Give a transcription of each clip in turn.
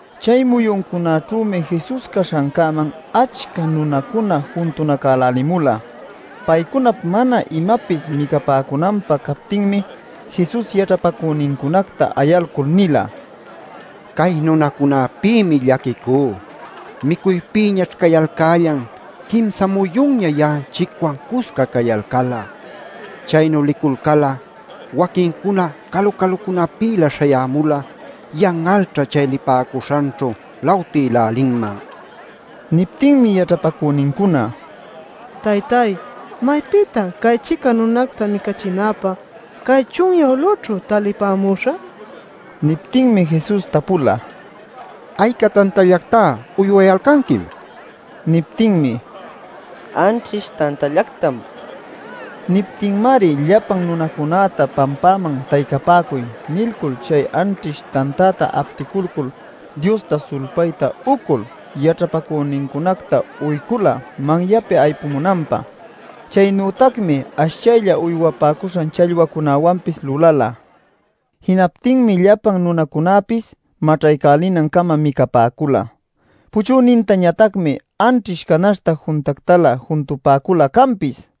Chay muyuncunaćhümi Jesus caśhancäman achca nunacuna juntunacälälimula. Paycunap mana imapis micapäcunanpä captinmi Jesus yaćhapacünincunacta ayalcul nila: “Cay nunacunäpïmi llaquicú. Micuypïñaćh cayalcällan quimsa muyunña ya'anchicwan cusca cayalcal'a. Chaynu liculcal'a waquincuna calu-calucunapïlä śhayämul'a yan'alćha chay lipäcuśhanćhu lawtïlälinman” nil. Niptinmi yaćhapacünincuna: “Taytáy, maypïtá cay-chica nunacta micachinapä cay chunyä ulüćhu talipämuśhä” nicuyalcan. Niptinmi Jesus tapula: “¿Ayca tantallactá uywayalcanquim?” nil. Niptinmi: “Anćhish tantallactam” nipäcula. Niptinmari llapan nunacunäta pampäman “taycapäcuy” nilcul chay anćhish tantäta apticulcul Diosta sulpayta ucul yaćhapacünincunacta uycula manyapi aypumunanpä. Chaynütacmi ashchaylla uywapäcuśhan challwacunäwanpis lulala. Jinaptinmi llapan nunacunäpis maćhaycälinancama micapäcula. Puchünintañatacmi anćhish canaśhta juntactalä juntupäcula canpis.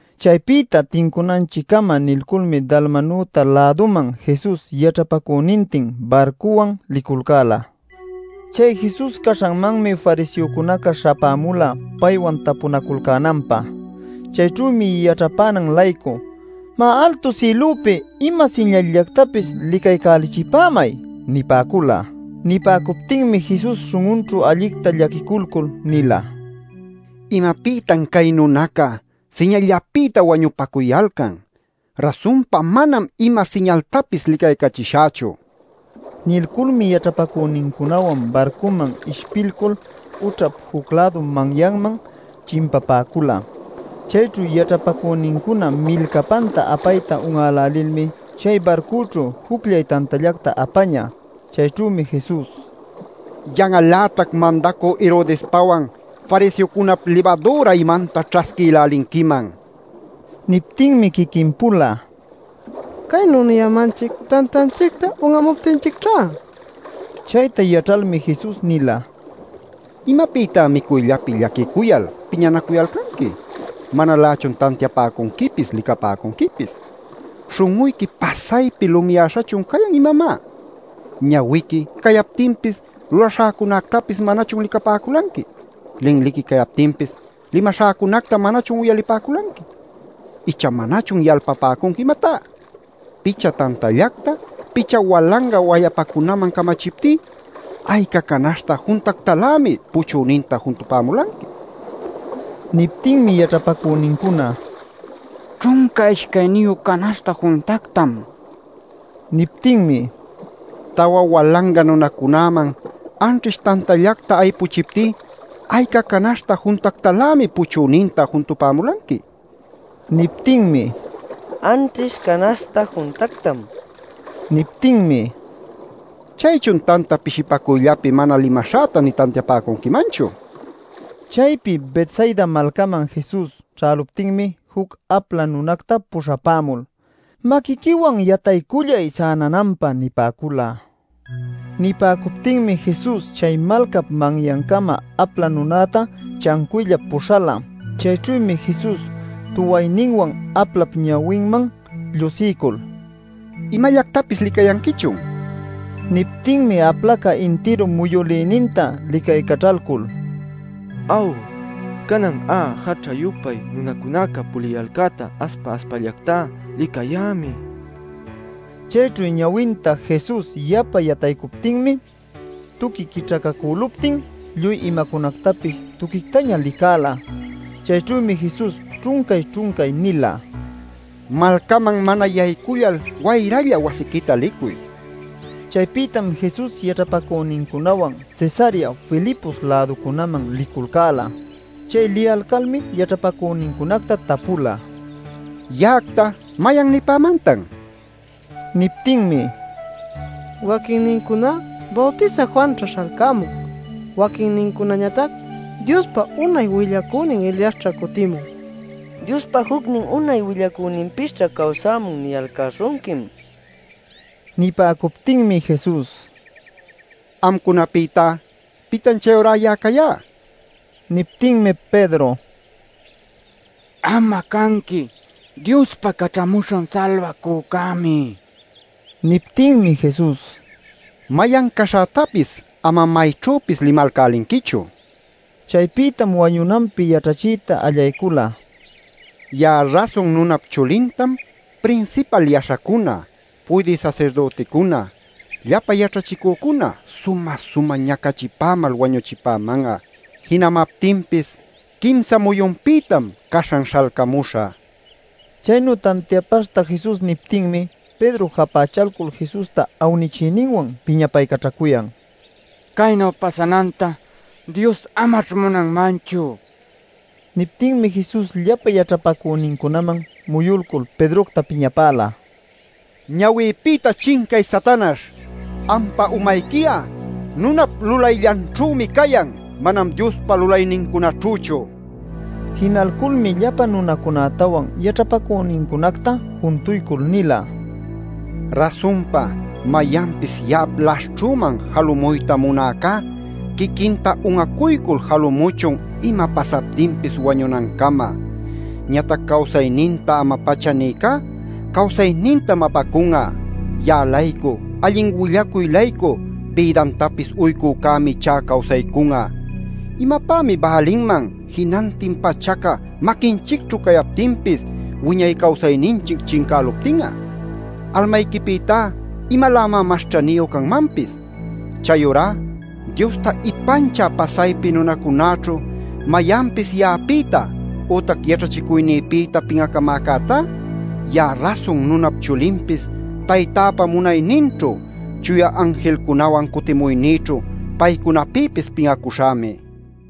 Chaypïta tincunanchiccama nilculmi Dalmanuta-läduman Jesus yaćhapacünintin barcuwan liculcäla. Chay Jesus caśhanmanmi fariseocunaca śhapämula paywan tapunaculcänanpä. Chayćhümi yaćhapänan-laycu: “Má, altu sïlupi ima siñalllactapis licaycälichipämay” nipäcula. Nipäcuptinmi Jesus śhun'unćhu allicta llaquiculcul nila: “¡¿Imapïtan cay nunacuna siñalllapïta wañupacuyalcan?! ¡Rasunpa manam ima siñaltapis licaycachishächu!” nin. Nilculmi yaćhapacünincunawan barcuman ishpilcul ućhap juc-lädu manyanman chimpapäcula. Chayćhu yaćhapacünincuna milcapanta apayta un'älälilmi chay barcućhu jucllay tantallacta apañä. Chayćhümi Jesus: “¡Yan'al-lätac mandacü Herodespawan, fariseocunap libadüra imanta ćhasquïlälinquiman!” nin. Niptinmi quiquin-pula: “Caynu niyämanchic tantanchicta un'amuptinchicćhá” ninaculcäla. Chayta yaćhalmi Jesus nila: “¿Imapïtá micuyllapi llaquicuyal piñanacuyalcanqui? ¿Manalächun tantiapäcunquipis licapäcunquipis? ¿Śhun'uyqui pasaypi lumiyäśhachun cayan, imamá? ¿Ñawiqui cayaptinpis lulaśhäcunactapis manachun licapäculanqui? ¿Linliqui cayaptinpis limaśhäcunacta manachun uyalipäculanqui? ¿Icha manachun yalpapäcunqui, imatá? Picha tantallacta picha walanga wayapacunaman camachiptí ¿ayca canaśhta juntactalämi puchüninta juntupämulanqui?” nil. Niptinmi yaćhapacünincuna: “Ćhunca ishcayniyu canaśhta juntactam” nipäcula. Niptinmi: “Tawa walanga nunacunäman anćhish tantallacta aypuchiptí, ¿ayca canaśhta juntactalämi puchüninta juntupämulanqui?” nin. Niptinmi: “Anćhish canaśhta juntactam” nin. Niptinmi: “¿Chaychun tanta pishipacuyllapi mana limaśhäta nï tantiapäcunquimanchu?” nin. Chaypi Betsaida malcaman Jesus ćhäluptinmi juc apla nunacta puśhapämul: “Maquiquiwan yataycullay sänananpä” nipäcula. Nipäcuptinmi Jesus chay malcap manyancama apla nunäta chancuyllap puśhäla. Chayćhümi Jesus tuwayninwan aplap ñawinman llushiycul “¿Imallactapis licayanquichun?” nila. Niptinmi aplaca intiru muyülïninta licaycaćhalcul: “Aw, canan'a jaćha-yupay nunacunaca puliyalcäta aspa-aspallactá licayämi” nin. Chayćhu ñawinta Jesus yapa yataycuptinmi tuqui quićhacacüluptin lluy imacunactapis tuquictaña licäla. Chayćhümi Jesus ćhuncay-ćhuncay nila: “Malcaman mana yaycullal wayralla wasiquita licuy” nil. Chaypïtam Jesus yaćhapacünincunawan Cesarea Filipos-läducunaman liculcäla. Chay liyalcalmi yaćhapacünincunacta tapula: “¿Ya'acta mayan nipämantan?” nil. Niptinmi: “Waquinnincuná: ‘Bawtisä Juanćha śhalcämun’; waquinnincunañatac: ‘Diospa unay willacünin Eliasćha cutïmun’; juccunañatac: ‘Diospa jucnin unay willacüninpisćha cawsämun’ niyalcäśhunquim” nipäcun. Nipäcuptinmi Jesus: “Amcunapïtá ¿pitan chayurá ya'a cayá?” nila. Niptinmi Pedro: “Am'a canqui Diospa Caćhamuśhan Salbacücämi” nin. Niptinmi Jesus: “Mayan caśhätapis amam mayanćhüpis limalcälinquichu” nila. Chaypïtam wañunanpi yaćhachiyta allaycula: “Ya'a Rasun Nunap Chulintam prinsipal yaśhacuna, puydï sasirdüticuna, llapa yaćhachicücuna sumä-sumä ñacachipämal wañuchipäman'a. Jinamaptinpis quimsa muyunpïtam caśhan śhalcamuśhä” nil. Chaynu tantiapaśhta Jesus niptinmi Pedro japächalcul Jesusta awnichiyninwan piñapaycaćhacuyan: “¡Caynu pasananta Dios amaćh munanmanchu!” nil. Niptinmi Jesus llapa yaćhapacünincunaman muyulcul Pedrocta piñapäla: “¡Ñawïpïta chincay, Satanaśh! ¡Ampa umayqui'a nunap lulayllanćhümi cayan, manam Diospa lulaynincunaćhüchu!” nil. Jinalculmi llapa nunacunätawan yaćhapacünincunacta juntuycul nila: “Rasunpa mayanpis ya'ap laśhćhüman jalumuyta munäcá quiquinta un'acuycul jalumuchun ima pasaptinpis wañunancama. Ñatac cawsayninta ama-pacha nïcá cawsaynintam apacun'a. Ya'a-laycu, allin willacuy-laycu bïdantapis uycücämi ichá cawsaycun'a. ¿Imapämi bälinman jinantin pachaca maquinchicćhu cayaptinpis wiñay cawsayninchic chincäluptin'a? ¡¿Almayquipïtá imalämá mas ćhaniyu canmanpis?! Chayurá Diosta ipanchä pasaypi nunacunäćhu mayanpis ya'apïta ütac yaćhachicuynïpïta pin'acamäcätá ya'a Rasun Nunap Chulinpis Taytäpa munayninćhu chuya anjilcunawan cutimuynïćhu paycunapïpis pin'acuśhämi” nila.